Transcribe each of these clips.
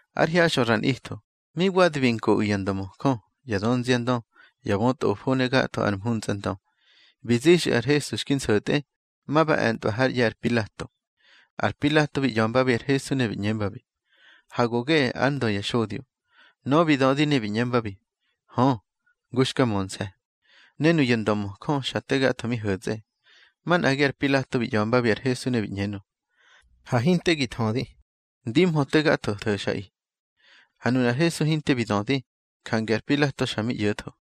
Ár hyaxꞌö ra nꞌitho, mi wadi bi nkoꞌu̱ ya ndömöjö, ya dönziandö, ya bötꞌofo ne gatho ar mhuntsꞌandö, bi zixꞌu̱ ar Hesu xki nso̱tꞌe, ma ba e̱ntꞌwa hár ꞌye̱ ar Pilato. Ar Pilato bi ꞌya̱mbabi ar Hesu ne bi ꞌñembabi: —Hage go geꞌe ár Ndö ya xodyo. Nöꞌö bi dödi ne bi ꞌñembabi: —Hö, ngu xka mönse̱. Ne nuya ndömöjö xa te gatho mi ho̱tsꞌe. Manꞌagi ar Pilato bi ꞌya̱mbabi ar Hesu ne bi ꞌñenö: —Ha hinte gi thödi. Ndimhö te gatho tho̱xꞌaꞌi. Ha nunar Hesu hinte bi dödi, jange ar Pilato xa mi ꞌyo̱tho.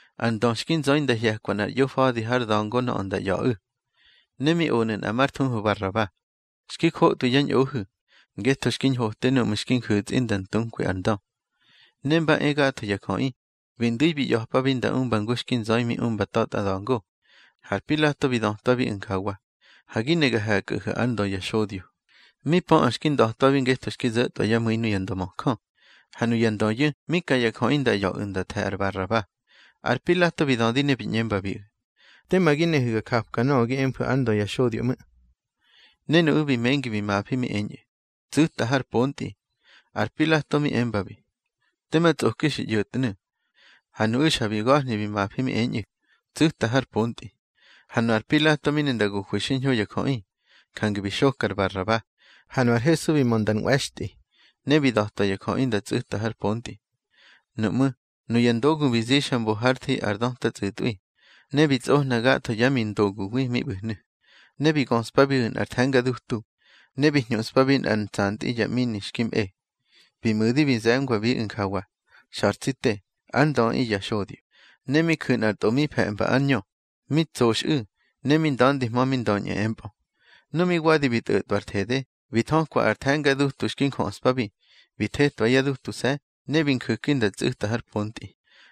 Ar ndö xki nzöi nda hye̱kwa nꞌar ꞌyofa̱di har da̱ngo nöꞌö nda ꞌya̱ꞌu̱. Ne mi onu̱ nꞌa már thuhu Baraba, xki jotꞌwi yá ñꞌohu̱, ngetho xki ñhote núꞌmu̱ xki nju̱tsꞌi nda ntukwi ar ndö. Ne mba e gatho ya jöꞌi, bi ndu̱i bi ꞌya̱pabi nda umba ngu xki nzöi mi umba ta̱tꞌa da̱ngo. Har Pilato bi dötwabiꞌu̱ njawa: —Ha gi ne ga he̱kꞌahu̱ ár Ndö ya xodyo. Mi pöꞌö xki nda̱twabi ngetho xki zo̱tꞌwa yá mu̱i nuya ndömöjö. Ha nuya ndöyu̱ mi ka ya jöꞌi nda ꞌya̱ꞌu̱ nda the̱ ar Baraba. Ar Pilato bi dödi ne bi ꞌñembabiꞌu̱: —Tema gi nehu̱ ga japka nöꞌö gi emfu̱ ár Ndö ya xodyo ꞌmu̱. Ne nuꞌu̱ bi mengi bi mafi, mi eñꞌu̱: —Tsu̱ta har pontꞌi. Ar Pilato mi embabi: —Tema tsꞌoki xi ꞌyo̱tnu̱. Ha nuꞌu̱ xa bi ga̱hni bi mafi mi eñꞌu̱: —Tsu̱ta har pontꞌi. Ha nu ar Pilato mi ne nda gohwi xiñho ya jöꞌi, jange bi xoka ar Baraba. Ha nu ar Hesu bi mö nda nꞌwe̱xtꞌi, ne bi da̱twa ya jöꞌi nda tsu̱ta har pontꞌi. Nuꞌmú̱, nuya ndogu bi zixa mbo hár thi ar döta tsꞌu̱tꞌwi, ne bi tsꞌohna gatho yá mindoguwi mi ꞌbu̱hnu̱. Ne bi göꞌspabiꞌu̱ nꞌar the̱nga dutu, ne bi hñuꞌspabi nꞌár ntsantꞌi ya ꞌmini xki mꞌe. Bi mu̱di bi ze̱ngwabiꞌu̱ njawa: —Xa̱r tsi te, ár Ndöꞌi ya xodyo. Ne mi ju̱ nꞌar tꞌo mi fe̱mba ár ñö, mi tsoxꞌu̱, ne mi nda̱ndihmö mi ndöñꞌu̱ empꞌö. Nu mi wadi bi tꞌo̱tꞌwa ar thede, bi thökwa ar the̱nga dutu xki njöꞌspabi, bi thetwa yá dutuse̱, ne bi nju̱ki nda tsꞌu̱ta har pontꞌi.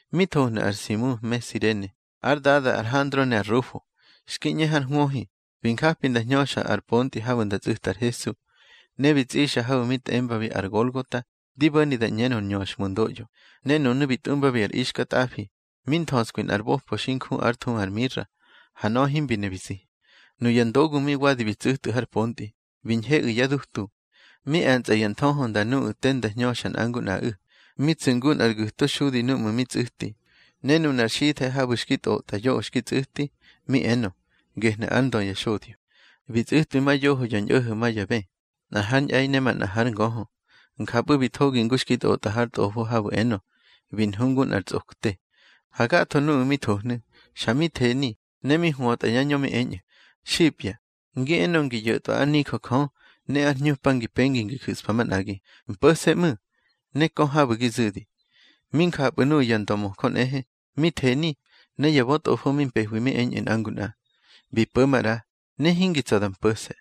Mi thohnu̱ ar Simu me Sirene, ár dada ar Handro ne ar Rufo, xki ꞌñe har hwöhi, bi njapi nda hñöxa ar pontꞌi habu̱ nda tsꞌu̱ta ar Hesu. Ne bi tsꞌixa habu̱ mi tꞌembabi ar Golgota, di bo̱ni da ꞌñenö Nñöxhmundoꞌyo. Ne nunu̱ bi tꞌumbabi ar ixkatꞌafi, mi nthöskwi nꞌar bopo xi nju ár thuhu ar mira, ha nöꞌö himbi ne bi zi. Nuya ndogu mi wadi bi tsu̱tꞌu̱ har pontꞌi, bi ñheꞌu̱ yá dutu, mi e̱ntsꞌa ya nthöhö nda nuꞌu̱ te nda hñöxa nꞌa ngu nꞌaꞌu̱. Mi tsu̱ ngu nꞌar gu̱to xudi núꞌmu̱ mi tsꞌu̱ti. Ne nunar xithe̱ habu̱ xki tꞌotꞌa yoꞌö xki tsꞌu̱ti, mi enö: Gehnu̱ ár Ndö ya xodyo. Bi tsꞌu̱twi ma yoho ya ñꞌo̱ho̱ ma ya bë, nꞌa hár ñꞌe̱i ne manꞌa hár ngöhö. Njapꞌu̱ bi thogi ngu xki tꞌotꞌa har Tꞌofo habu̱ enö: Bi nhu ngu nꞌar tsꞌokte. Ha gatho nuꞌu̱ mi thohnu̱, xa mi theni, ne mi hwötꞌa yá ñö mi eñꞌu̱: —Xipya, ngi enö ngi yo̱tꞌwa ár nijö Jö, ne ar hñupa ngi pengi ngi ju̱spa manꞌagi, mpo̱se̱ ꞌmu̱, ne kö habu̱ gi zu̱di. Mi njapꞌu̱ nuꞌu̱ ya ndömöjö nꞌehe, mi theni. Ne ya bötꞌofo mi mpehwi mi eñꞌu̱ nꞌa ngu nꞌa: —Bi po̱ maꞌra, ne hingi tsa̱ da mpo̱se̱.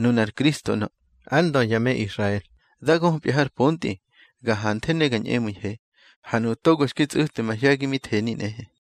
Nunar Kristo ꞌnö, ár Ndö ya me Israel, dá göpya har pontꞌi. Ga hanthe ne ga ñꞌemu̱ihe. Ha nuꞌu̱ togo xki tsꞌu̱twi mahye̱gi mi theni nꞌehe.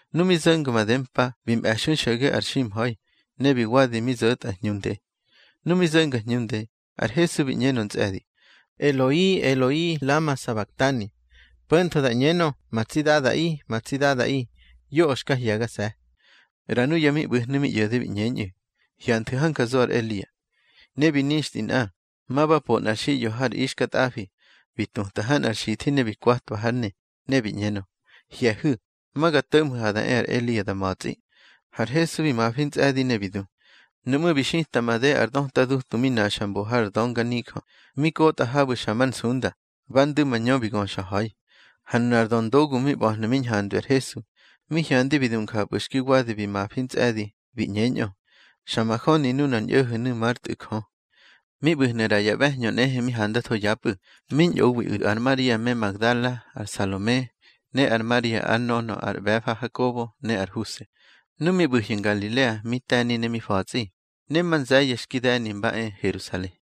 Nu mi zo̱nga madempa bi mꞌe̱xui xo̱ge ar ximha̱i, ne bi wadi mi zo̱tꞌa hñunde. Nu mi zo̱nga hñunde, ar Hesu bi ꞌñenö ntsꞌe̱di: —Eloi, Eloi lama sabaktani, —po̱ntho da ꞌñenö: Ma tsi Dadaꞌi, ma tsi Dadaꞌi, yoꞌö xka hye̱gase̱. ꞌRa nuya mi ꞌbu̱hnu̱ mi ꞌyo̱de bi ꞌñeñꞌu̱: —Hyanthu̱ hanja zo ar Elia. Ne bi nixtꞌi nꞌa, ma ba po nꞌar xiꞌyo har ixkatꞌafi. Bi tuta ha nꞌar xithi ne bi kwatwa hár ne, ne bi ꞌñeñꞌö: —Hye̱hu̱, ma ga to̱ꞌmhu̱ ha da e ar Elia da ma̱tsꞌi. Har Hesu bi mafi ntsꞌe̱di, ne bi du. Nuꞌmú̱ bi xita made ar döta dutu mi naxa mbo har dönga nijö, mi kotꞌa habu̱ xa mar nsunda, ba ndu̱ mañö bi göxa ha̱i. Ha nunar döndogu mi ꞌba̱hnu̱ mi ñhandwi ar Hesu, mi hyandi bi du njapꞌu̱ xki wadi bi mafi ntsꞌe̱di, bi ꞌñeñꞌö: —Xa majöni nunar ñꞌo̱ho̱nu̱ már Tꞌu̱ Jö. Mi ꞌbu̱hnu̱ ꞌra ya ꞌbe̱hñö nꞌehe mi handatho yapꞌu̱. Mi ñꞌowiꞌu̱ ar Maria me Magdala, ar Salome, ne ar Maria ár nönö ar ꞌbe̱fa Hakobo ne ar Huse. Nu mi ꞌbu̱hyu̱ Ngalilea mi te̱ni ne mi fa̱tsꞌi, ne ma nze̱ye̱ xki de̱ni mba e Herusale.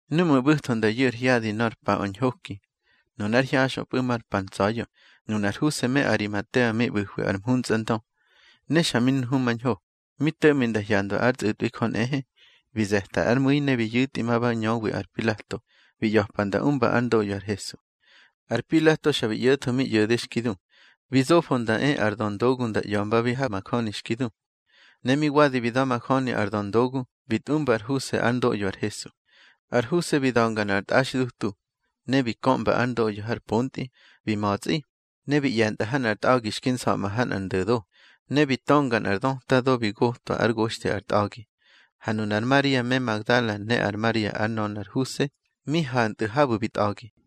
Núꞌmu̱ ꞌbu̱tho nda yu̱ ar hyadi nor paꞌö ar ñhoki, nunár hyaxꞌöpꞌu̱ mar pa ntsa̱ya̱, nunar Huse me Arimatea mi ꞌbu̱hwi ar mhuntsꞌandö, ne xa mi nhumañho, mi to̱ꞌmi nda hyandwa ár tsꞌu̱tꞌwi Jö nꞌehe, bi ze̱ta ár mu̱i ne bi yu̱tꞌi ma ba ñöwi ar Pilato, bi ꞌya̱pa nda umba ár ndoꞌyo ar Hesu. Ar Pilato xa bi ꞌyo̱tho mi ꞌyo̱de xki du. Bi zofo nda e ar döndogu nda ꞌya̱mbabi ha majöni xki du. Ne mi wadi bi da̱majöni ar döndogu, bi tꞌumba ar Huse ár ndoꞌyo ar Hesu. Ar Huse bi da̱nga nꞌar tꞌaxdutu, ne bi köꞌmba ár ndoꞌyo har pontꞌi. Bi ma̱tsꞌi, ne bi ꞌye̱ntꞌa ha nꞌar tꞌa̱gi xki nsa̱ꞌma ha nꞌar ndo̱do, ne bi tönga nꞌar döta do bi gotwa ár goxthi ar tꞌa̱gi. Ha nunar Maria me Magdala ne ar Maria ár nönö ar Huse mi hantꞌu̱ habu̱ bi tꞌa̱gi.